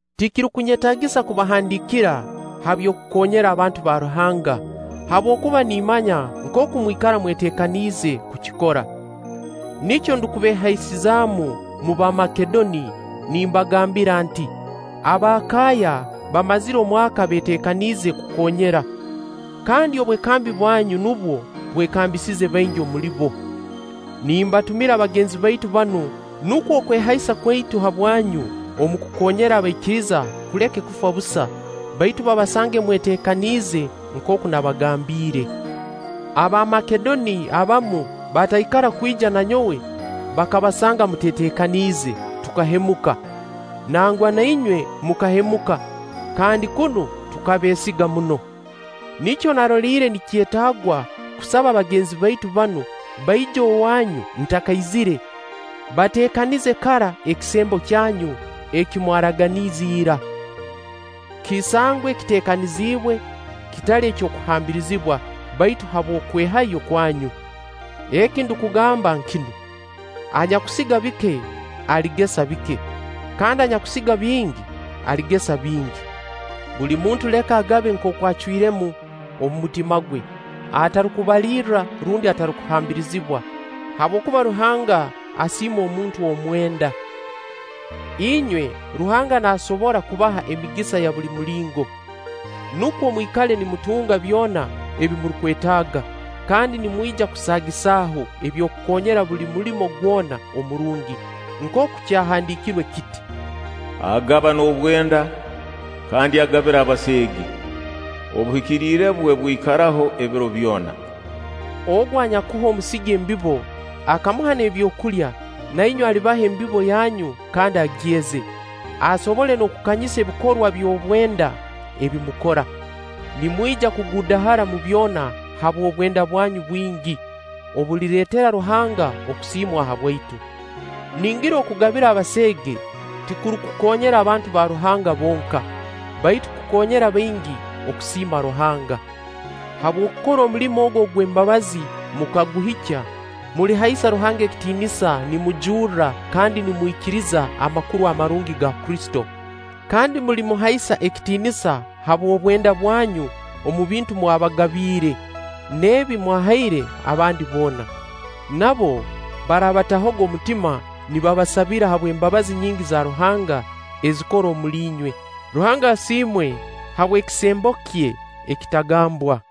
Tikirukunyetaagisa kubahandiikira ha by'okukoonyera abantu ba Ruhanga, habwokuba nimmanya nkooku mwikara mweteekaniize kukikora. Nikyo ndukubeehaisizaamu omu Bamakedoni nimbagambira nti: Abaakaaya bamazire omwaka beeteekaniize kukoonyera. Kandi obwekambi bwanyu nubwo bwekambisize baingi omuli bo. Nimbatumira bagenzi baitu banu, nukwo okwehaisa kwaitu habwanyu omu kukoonyera abaikiriza kuleke kufa busa, baitu babasange mweteekaniize nkooku nabagambiire. Abamakedoni abamu bataikara kwija na nyowe bakabasanga muteeteekaniize, tukahemuka-nangwa na inywe mukahemuka-kandi kunu tukabeesiga muno. Nikyo naroliire nikyetaagwa kusaba bagenzi baitu banu baije owaanyu ntakaizire, bateekanize kara ekisembo kyanyu eki mwaraganiize ira. Kisangwe kiteekaniziibwe, kitali ky'okuhambirizibwa, baitu habw'okwehayo kwanyu. Eki ndukugamba nkinu: anyakusiga bike, aligesa bike; kandi anyakusiga bingi, aligesa bingi. Buli muntu leka agabe nkooku acwiremu omu mutima gwe, atarukubalirra rundi atarukuhambirizibwa; habwokuba Ruhanga asiima omuntu omwenda. Inywe, Ruhanga naasobora kubaha emigisa ya buli mulingo, nukwo mwikale nimutunga byona ebi murukwetaaga, kandi nimwija kusaagisaho eby'okukoonyera buli mulimo gwona omurungi. Nkooku kyahandiikirwe kiti: “Agaba n'obwenda, kandi agabira abaseege; obuhikiriire bwe bwikaraho ebiro byona.” Ogu anyakuha omusigi embibo, akamuha n'ebyokulya, na inywe alibaha embibo yanyu kandi agyeze. Asobole n'okukanyisa ebikorwa by'obwenda ebi mukora. Nimwija kuguudahara omu byona habw'obwenda bwanyu bwingi obulireetera Ruhanga okusiimwa habwaitu. Ningira okugabira abaseege tikurukukoonyera abantu ba Ruhanga bonka, baitu kukoonyera baingi okusiima Ruhanga. Habw'okukora omulimo ogu ogw'embabazi mukaguhikya, mulihaisa Ruhanga ekitiinisa nimujurra kandi nimwikiriza Amakuru Amarungi ga Kristo. Kandi mulimuhaisa ekitiinisa habw'obwenda bwanyu omu bintu mwabagabiire n'ebi mwahaire abandi boona. Nabo baraabatahoga omutima nibabasabira habw'embabazi nyingi za Ruhanga ezikora omuli inywe. Ruhanga asiimwe habw'ekisembo kye ekitagambwa.